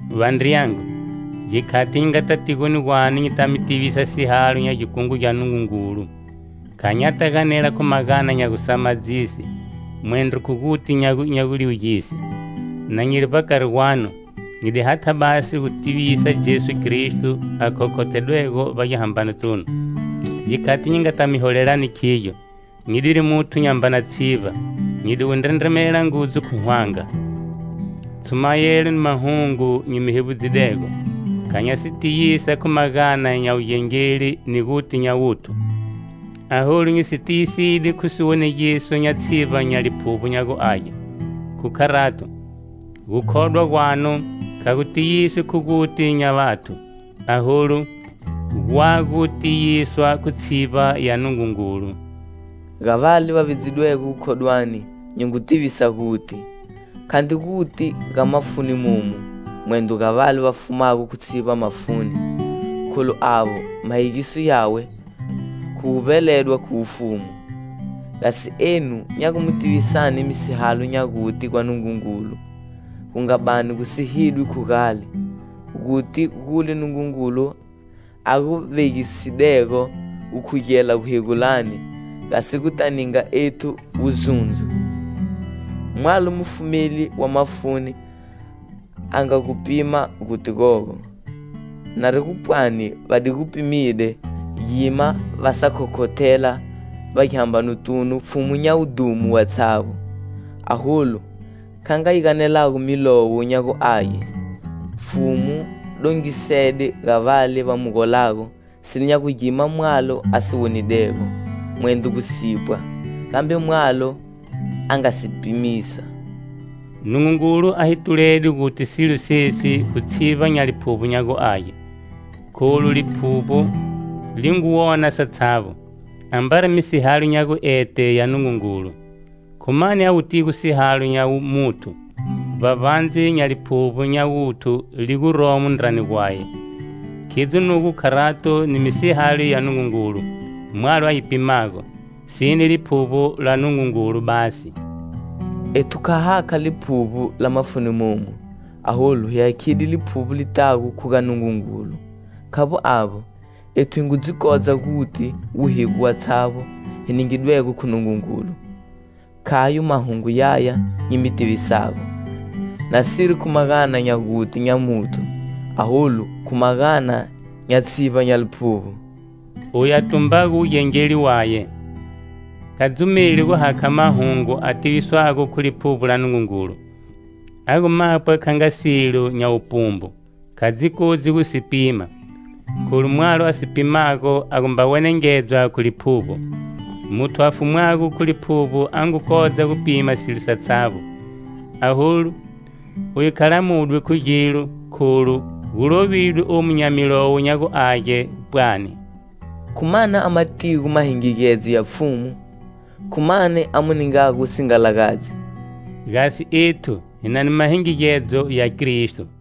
Vandriyangu, gikhati nyi ngata tigoni gwanu nyita mi tivisa sihalo nya gikungu gya Nungungulu, kha nyata ganela khu magana nya gusamadzise, mwendro khu guti nya guliwugise. Na nyiri vbakari gwanu, nyi di hatha basi gu mi tivisani Jesu Kristo a khokhothedwego vbagihambanotunu. Gikhati nyi ngata mi holelani khigyo, nyi diri muthu nyambana tshivba, nyi di gu ndrendremela ngudzu khu hwanga. Tshumayelo ni mahungu nyi mi hevbudzidego, kha nya si tiyisa khu magana nya wugengeli ni guti nya wuthu, aholu nyi si tiyiside khu siwonegiso nya tshivba nya Liphuvbo nya gu Age. Khu kharato, gukhodwa gwanu kha gu tiyiswi khu guti nya vathu, aholu, gwa gu tiyiswa khu tshivba ya Nungungulu. Ga vale va vidzidwego gukhodwani, nyi ngu tivisa guti. Khandri guti ga mafuni momu, mwendro ga vale va fumago khu tshivba mafuni, kholu avo, mahegiso yawe khu gu vbeledwa khu wufumu; gasi enu nya gu mi tivisani misihalo nya guti gwa Nungungulu, gu nga bani gu sihidwe khu gale; guti gule Nungungulu a gu vegisidego gukhugela guhegulani, gasi guta ninga ethu wuzundzo. Mwalo mufumeli wa mafuni a nga gu pima guti gogo. Nari gu pwani va di gu pimide, gima va sa khokhothela vbagihambanotunu Pfhumu nya wudhumo watshavbo. Aholu, kha nga yi ganelago Milowo nya gu Age: "Pfhumu dongisede ga vale va mu golago silo nya gu gima mwalo a si wonidego, mwendro gu sipwa, gambe mwalo a nga si pimisa." Nungungulu a hi tulede guti silo sesi khu tshivba nya Liphuvbo nya gu Age, kholu Liphuvbo li ngu wona satshavbo, ambari misihalo nya guete ya Nungungulu. Khu mani a wutigo sihalo nya muthu, vbavbandze nya liphuvbo nya wuthu li guromo ndrani gwaye? Khidzo nugo kharato ni misihalo ya Nungungulu, mwalo a yi pimago, sine Liphuvbo la Nungungulu basi. Ethu kha ha hakha liphuvbo la mafuni momu, aholu hi hakhide Liphuvbo li tago khu ga Nungungulu. Khavbo avbo, ethu hi ngu dzi kodza guti wuhigo watshavbo hi ningidwego khu Nungungulu. Khayo mahungu yaya nyi mi tivisago, nasiri khu magana nya guti nya muthu, aholu khu magana nya tshivba nya Liphuvbo. Oyu a tumbago wugengeli waye, kha dzumeli gu hakha mahungu a tiviswago khu Liphuvbo la Nungungulu, a gu mapwa kha nga silo nya wupumbu. Kha dzi kodzi gu si pima, kholu mwalo a si pimago a gu mba wenengedzwa khu Liphuvbo. Muthu a fumwago khu Liphuvbo a ngu kodza gu pima silo satshavbo, aholu, uye kha lamudwi khu gilo kholu gu lovidwe omu nya Milowo nya gu Age pwani: "Khu mani a matigo mahingigedzo ya Pfhumu?Khu mani a mu ningago wusingalagadzi?" Gasi ethu, hi na ni mahingigedzo ya Kristo.